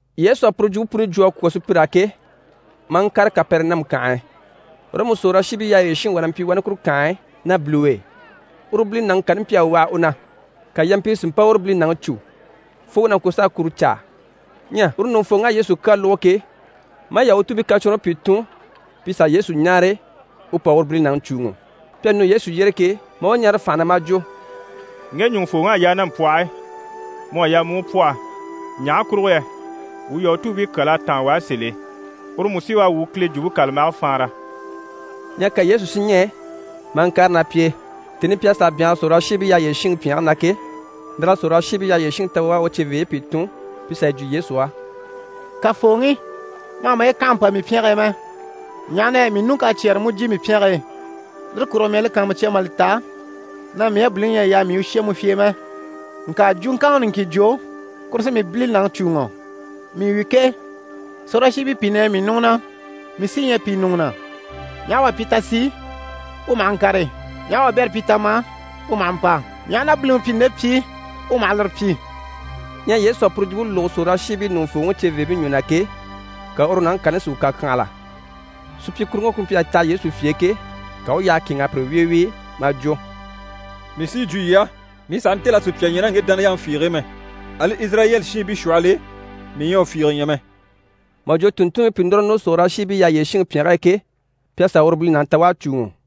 Yesu à puru jwumpe puni jwo a kwɔ̀ sùpyir'á ke, maa ŋkàre Kapɛrɛnamu kànhe e. Ɔrɔmu sòrolashiibii yyaha yyére shinŋi wà na mpyi wani kuru kànhe e ná biliwe e. Uru bilinaŋi kani mpyi a waha u na. Ka yampimɛ si mpa uru bilinaŋi cû, fo u na ŋko s'a kuro caa. Ɲyɛ uru ɲùŋufooŋ'à Yesu kyaa lógo ke, maa Yahutuubii kacwɔnribii pìi tun pi sà Yesu ɲáare u u mpa uru bilinaŋi cùuŋɔ. Pi à nɔ Yesu yyére ke, maa u ɲáare fànha na, maa jwo: «Ŋge ɲùŋufooŋ'à yaa ná mpwɔh'e, mu à yaa mu u u pwɔhɔ. Ɲaha kurugo yɛ wuu Yahutuubii kyal'à táan u á sèl'e. Uru mú sí u à wuu Kile Jwumpe kàlambage faanra.» Ɲyɛ ka Yesu si ɲɛɛ maa ŋkàre ná pi e. Tèni i pi à sà byanhara sòrolashiibii yyaha yyére shinŋi pyɛnge na ke, lir'à sòrolashiibii yyaha yyére shinŋi ta u à u ceveebii pìi tun pi sà yi jwo Yesu á: «Kafooŋi, ma hà maye kànha mpa mii pyɛnge e mɛ, ɲaha na yɛ mii ɲùŋk'à cyɛ́rɛ mu u jyè mii pyɛnge e. Lire kurugo mii à li kàanmucya mà li ta na mii yabiliŋi ɲyɛ a yaa mii u shà mu fye e mɛ. Ŋka jwuŋkanŋa niŋkin jwo, kuru sí mii bilinaŋi cùuŋɔ. Mii wi ke, sòrolashiibii pìi na ɲyɛ mii ɲùŋɔ na, mii sí ɲyɛ pìi ɲùŋɔ na. Mii aha wà pyi “Ta sì” u maha ŋkàre. Mii aha wabɛrɛ pyi “Ta ma” u maha mpa. Mii aha na biliŋi pyi “Nde pyi” u maha lire pyi.» Ɲyɛ Yesu à puru jwumpe lógo sòrolashiibii ɲùŋufooŋi ceveebii ɲwɔ na ke, ka uru nàŋi kani si u kàkyanhala. Supyikuruŋke ku mpyi a taha Yesu fye e ke, ka u u yyaha kɛ̂ɛnŋ'a pi wíi wíi, maa jwo: «Mii sí yi jwo yii á, mii sàha ntêl'a sùpya ɲya ná ŋge dániyaŋi fiige e mɛ, ali Izirayɛli shiinbii shwɔhɔl'e mii ɲyɛ a u fiige ɲya mɛ.» Mà jwo tùnntunmpii pi núr'a nɔ sòrolashiibii yyaha yyére shinŋi pyɛnge e ke, pi à sà uru bilinaŋi ta u à cùuŋɔ.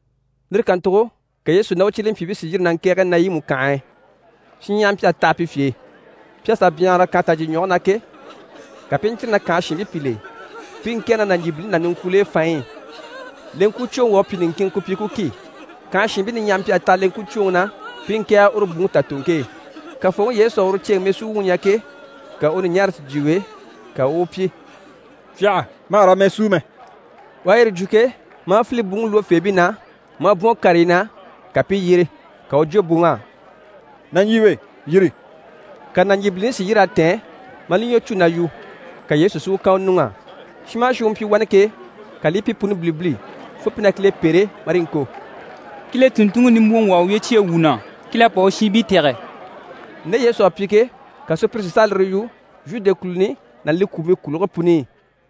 Lire kàntugo ka Yesu ná u cyelempyiibii si yîri na ŋkɛ̀ɛge Nayimu kànhe e, shinɲyahara mpyi a taha pi fye e. Pi à sà byanhara kànhe tajyiɲwɔge na ke, ka pi i ɲcíri ná kànhe shiinbii pìl'e, pi i ŋkɛ̀ɛge ná nàɲjiibilini là niŋkwul'e fanɲyi i. Leŋkwucwoŋi wà u pyìniŋkinge ku mpyi ku ki. Kànha shiinbii niɲyahamii mpyi a taha leŋkwucwoŋi na, pi i ŋkɛ̀ɛge uru buŋi tatoŋke e. Kafooŋi Yesu à uru ceeŋi mɛɛsuwuŋi ɲya ke, ka u ɲùɲaare si jyè u e, ka u u u pyi: «Fyâha, ma hà raa mɛɛ súu mɛ!» U à yire jwo ke, maa file buŋi lwɔ́feebii na, maa bwɔ̀n kariyi na, ka pi i yyére. Ka u u jwo buŋ'á: «Nàɲjiiwe, yîri!» Ka nàɲjiiŋi si yîr'a tɛ̀ɛn, maa li ɲwɔ cû na yu, ka Yesu si u kan u nuŋ'á. Shin maha shin u mpyi wani ke, ka li i pi puni bilibili, fo pi na Kile pêre marii ŋko: «Kile tùnntunŋi nimbwoŋi wà u à uye cyêe wuu na! Kile à pa u shiinbii tɛ̀gɛ!» Nde Yesu à pyi ke, ka sùpyire si sà a lire yu Zhude kùluni ná li kwùumpe kùligii puni i.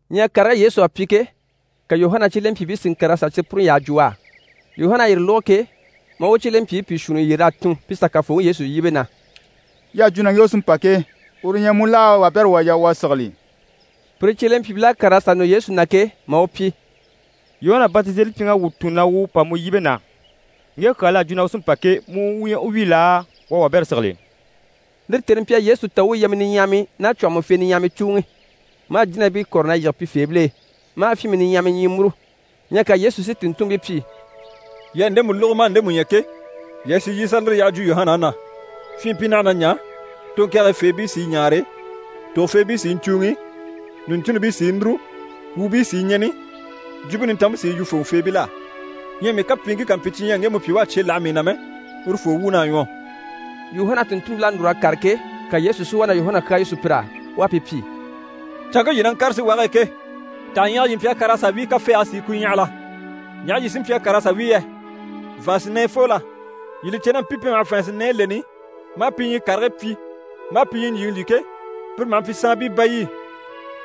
Ɲyɛ karigii Yesu à pyi ke, ka Yuhana cyelempyiibii si ŋkàr'a sà cyire puni yyaha jwo u á. Yuhana à yire lógo ke, maa u cyelempyiibii pìi shuunni yyér'a tun pi sà Kafooŋi Yesu yíbe na: «Y'à jwo na ŋge u sí n‑pa ke, uru u ɲyɛ mu laa, wabɛrɛ wuu à yaa wuu a sigili?» Pire cyelempyiibil'à kàr'a sà nɔ Yesu na ke, maa u pyi: «Yuhana Batizelipyiŋi à wuu tun na wuu pa mu yíbe na “Ŋgemu kyaa l'à jwo na u sí n‑pa ke, mu u ɲyɛ u wi laa, wuu a wabɛrɛ sigili?”» Lire tèni mpyi a Yesu ta u u yamii niɲyahamii ná cwɔ̀hɔmɔfee niɲyahamii cùuŋi, maa jínabii kɔ̀re na yige pifeebil'e, maa fyinmii niɲyahamii ɲyii múru. Ɲyɛ ka Yesu si tùnntunmpii pyi: «Yii à ndemu lógo maa ndemu ɲya ke, yii a sì, yii i sà lire yyaha jwo Yuhana á na: fyinmpii naha na ɲaa, toŋkɛgɛyifeebii sí i ɲaare, tògofeebii sí i ɲcùuŋi, ɲùɲcunnibii sí i núru, kwùubii sí i ɲɛ̀ni, Jwumpe Nintanmpe sí i yu fòŋɔfeebil'á. Ɲyɛ mii kapyiiŋkii ká mpyi cyi ɲyɛ a ŋgemu pyi u à cye láha mii na mɛ, urufoo wuun'à ɲwɔ.» Yuhana tùnntunmpil'à núr'a kàre ke, ka Yesu si wá na Yuhana kyaa yu sùpyir'á, u à pi pyi: «Canŋke yii ná ŋkàre síwage e ke, taha ɲyɛgɛ yii mpyi a kàr'a sà wíi kafɛɛge sí i ku ɲyàha la? Ɲaha yii sí mpyi a kàr'a sà wíi yɛ? Vàansinayafoo la? Yii li cè na mpii pi maha vàansinayi leni, maa pi ɲyii karigii pyi, maa pi ɲyii ɲjyìŋi lyî ke, pire maha mpyi saanbii bayi i.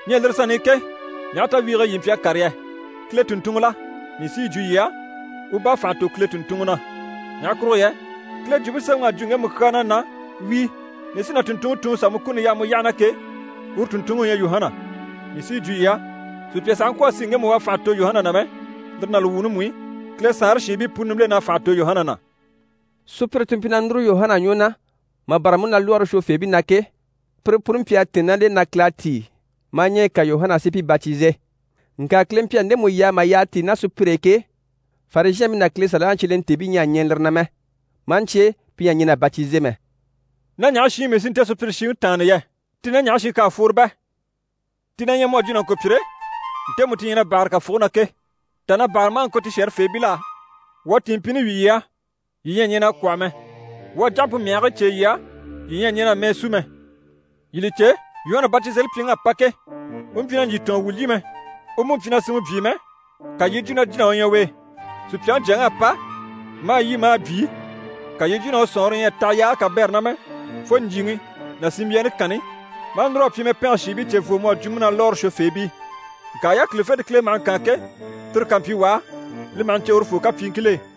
Ɲyɛ lire sanni i ke, ɲaha tawiige e yii mpyi a kàre yɛ? Kile tùnntunŋɔ la? Mii sí yi jwo yii á, u bá à fànha tò Kile tùnntunŋɔ na. Ɲaha kurugo yɛ Kile Jwumpe Semɛŋi à jwo ŋgemu kyaa na na “Wíi, mii sí na tùnntunŋi tun u sà mu kuni yaa mu yyaha na” ke, uru tùnntunŋi u ɲyɛ Yuhana. Mii sí yi jwo yii á, sùpya sàha ŋkwɔ̀ a si ŋgemu u à fànha tò Yuhana na mɛ, lire ná li wuuni mú i, Kile Saanre shiinbii puni nimbilen'à fànha tò Yuhana na. Sùpyire ti mpyi na núru Yuhana ɲwɔ na, mà bâra múnalwɔɔre shwofeebii na ke, pire puni mpyi a tɛ̀ɛn ná l'e na Kile à tíi, maa ɲɛɛ ka Yuhana si pi batize. Ŋka Kile mpyi a ndemu yaa mà yyaha tíi ná sùpyire e ke, Farizhɛɛnbii ná Kile Saliyaŋi cyelentiibii ɲyɛ a ɲɛɛ lire na mɛ, maa ɲcyé pi ɲyɛ a ɲɛn'a batize mɛ. Ná ɲaha shi i, mii sí nte sùpyire shiŋi tàanna yɛ? Ti ná ɲaha shi k'à fworo bɛ? Ti na ɲyɛ mu à jwo nàŋkopyire, ntemu ti ɲyɛ na bâhare kàfuge na ke, tà na bâhare maa ŋko ti shɛ̀rɛfeebil'á: “Wuu à tìinmpini wyì yii á, yii ɲyɛ a ɲɛn'a kwɔ̂hɔ mɛ. Wuu à jáhampe myahigii cêe yii á, yii ɲyɛ a ɲɛn'a mɛɛ sú mɛ.” Yii li cè, Yuhana Batizelipyiŋi à pa ke, u mpyi na ɲjyì tɔɔn wu lyî mɛ, u mú mpyi na sinmɛ byii mɛ, ka yii i jwo na jína u ɲyɛ u e. Supyaŋi Jyaŋi à pa, maa lyî maa byii, ka yii i jwo na u sɔ̀nŋɔre ɲyɛ a taha yaage kabɛrɛ na mɛ, fo ɲjyìŋi ná sinmbyaani kanni, maa núr'a pyi mɛpɛngɛ shiinbii cevoo mu à jwo múnalwɔɔre shwofeebii. Ŋka yákilifente Kile maha ŋkaan ke, tire ká mpyi wà á, li maha ɲcè urufoo kapyiiŋkil'e.»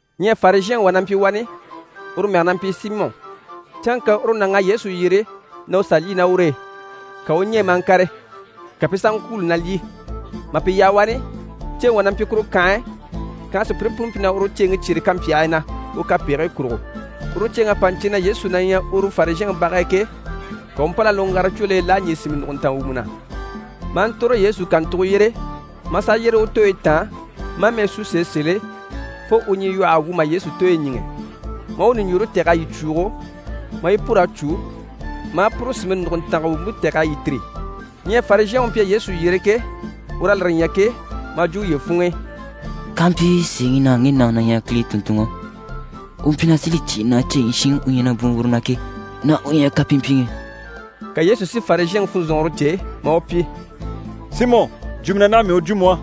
Ɲyɛ Farizhɛnŋi wà na mpyi wani, uru mɛge na mpyi Simɔ. Canŋka uru nàŋ'à Yesu yyere na u sà lyî ná ur'e, ka u u ɲɛɛ maa ŋkàre, ka pi i sà ŋkwûulo na lyî. Mà pi yaha wani, ceeŋi wà na mpyi kuru kànhe e, kànhe sùpyire puni mpyi na uru ceeŋi cyêre kampyahii na, u kapegigii kurugo. Uru ceeŋ'à pa ɲcè na Yesu na ɲyɛ uru Farizhɛnŋi bage e ke, ka u u mpa ná loŋgaracwol'e, l'à ɲî sìnmɛ nùguntanga wumɔ na. Maa ntòro Yesu kàntugo yyére mà sà yyére u tooyi taan, maa mɛɛ sú sèe sèl'e, fo ɲyii lwɔh'à wu mà Yesu tooyi ɲíŋɛ, maa u ɲùɲjoore tɛ̀g'a yi cwuugo, maa yi pûr'a cû, maa puru sìnmpe nùguntanga wumpe tɛ̀g'a yi tìri. Ɲyɛ Farizhɛnŋi u mpyi a Yesu yyere ke, ur'à lire ɲya ke, maa jwo uye funŋ'i: «Kampyi sèeŋi na ŋge nàŋi na ɲyɛ Kile tùnntunŋɔ, u mpyi na sí li cè na ceeŋi shiŋi u ɲyɛ na bwùun uru na ke, na u ɲyɛ kapimpyiŋɛ.» Ka Yesu si Farizhɛnŋi funzɔnŋɔre cè, maa u pyi: «Simɔ, jwumɔ na naha mii u jwo mu á.»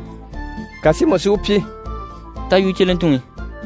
Ka Simɔ si u pyi: «Ta yu, cyelentuŋi.»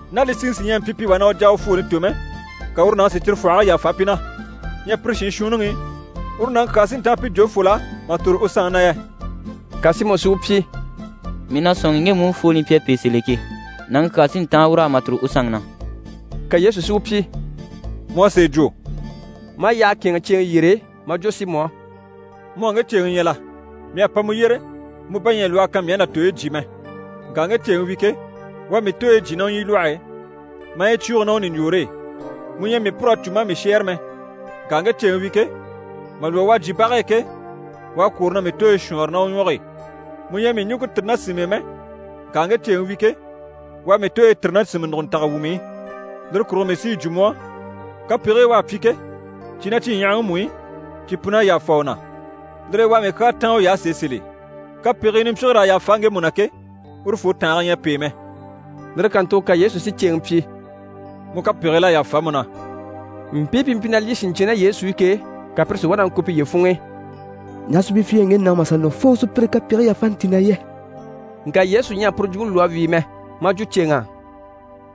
Ná li síŋi sí ɲyɛ a pyi pi wà na mà jà a u fwooni tò mɛ, ka uru nàŋi si cyire fwɔhigii yàfa pi na. Ɲyɛ pire shiin shuunniŋi i, uru nàŋi kyaa sí n‑táan pi jofol'á mà tòro u sanŋi na yɛ?» Ka Simɔ si u pyi: «Mii na sɔ̂nŋi ŋgemu u fwoo li mpyi a pêe sèl'e ke, nàŋi kyaa sí n‑táan ur'á mà tòro u sanŋi na.» Ka Yesu si u pyi: «Mu à sèe jwo.» Maa yyaha kɛ̂ɛnŋɛ ceeŋi yyére maa jwo Simɔ á: «Mu à ŋge ceeŋi ɲya la? Mii à pa mu yyére, mu bá ɲyɛ a lwɔhɔ kan mii i na tooyi jyé mɛ. Ŋka ŋge ceeŋi wi ke, u à mii tooyi jyé ná u ɲyilwɔhe e, maa yi cwuugo ná u ɲùɲjoore e. Mu ɲyɛ a mii pûr'a cû maa mii shɛ́ɛre mɛ, ŋka ŋge ceeŋi wi ke, mà lwɔ́ u à jyè bage e ke, u à kwôro na mii tooyi shwɔɔnre ná u ɲwɔge e. Mu ɲyɛ a mii ɲùŋke tìri ná sìnm'e mɛ, ŋka ŋge ceeŋi wi ke, u à mii tooyi tìri ná sìnmɛ nùguntanga wum'i. Lire kurugo mii sí yi jwo mu á, kapegigii u à pyi ke, cyi ná cyi ɲyahaŋi mú i, cyi pun'à yàfa u na. Lire e u à mii kyaa táan uy'á sèe sèl'e. Kapegii nimpyigir'à yàfa ŋgemu na ke, urufoo tàange ɲyɛ a pêe mɛ.» Lire kàntugo ka Yesu si ceeŋi pyi: «Mu kapegigil'à yàfa mu na.» Mpii pi mpyi na lyî siɲcyan ná Yesu i ke, ka pire si wá na ŋko piye funŋ'i: «Ɲaha supyifiiwe u ɲyɛ ŋge nàŋi mà sà nɔ, fo u u sùpyire kapegigii yàfani ti na yɛ?» Ŋka Yesu ɲyɛ a puru jwumpe lwɔ́ a wíi mɛ, maa jwo ceeŋ'á: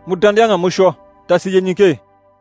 «Mu dániyaŋ'à mu shwɔ, ta sì yyeɲiŋke e.»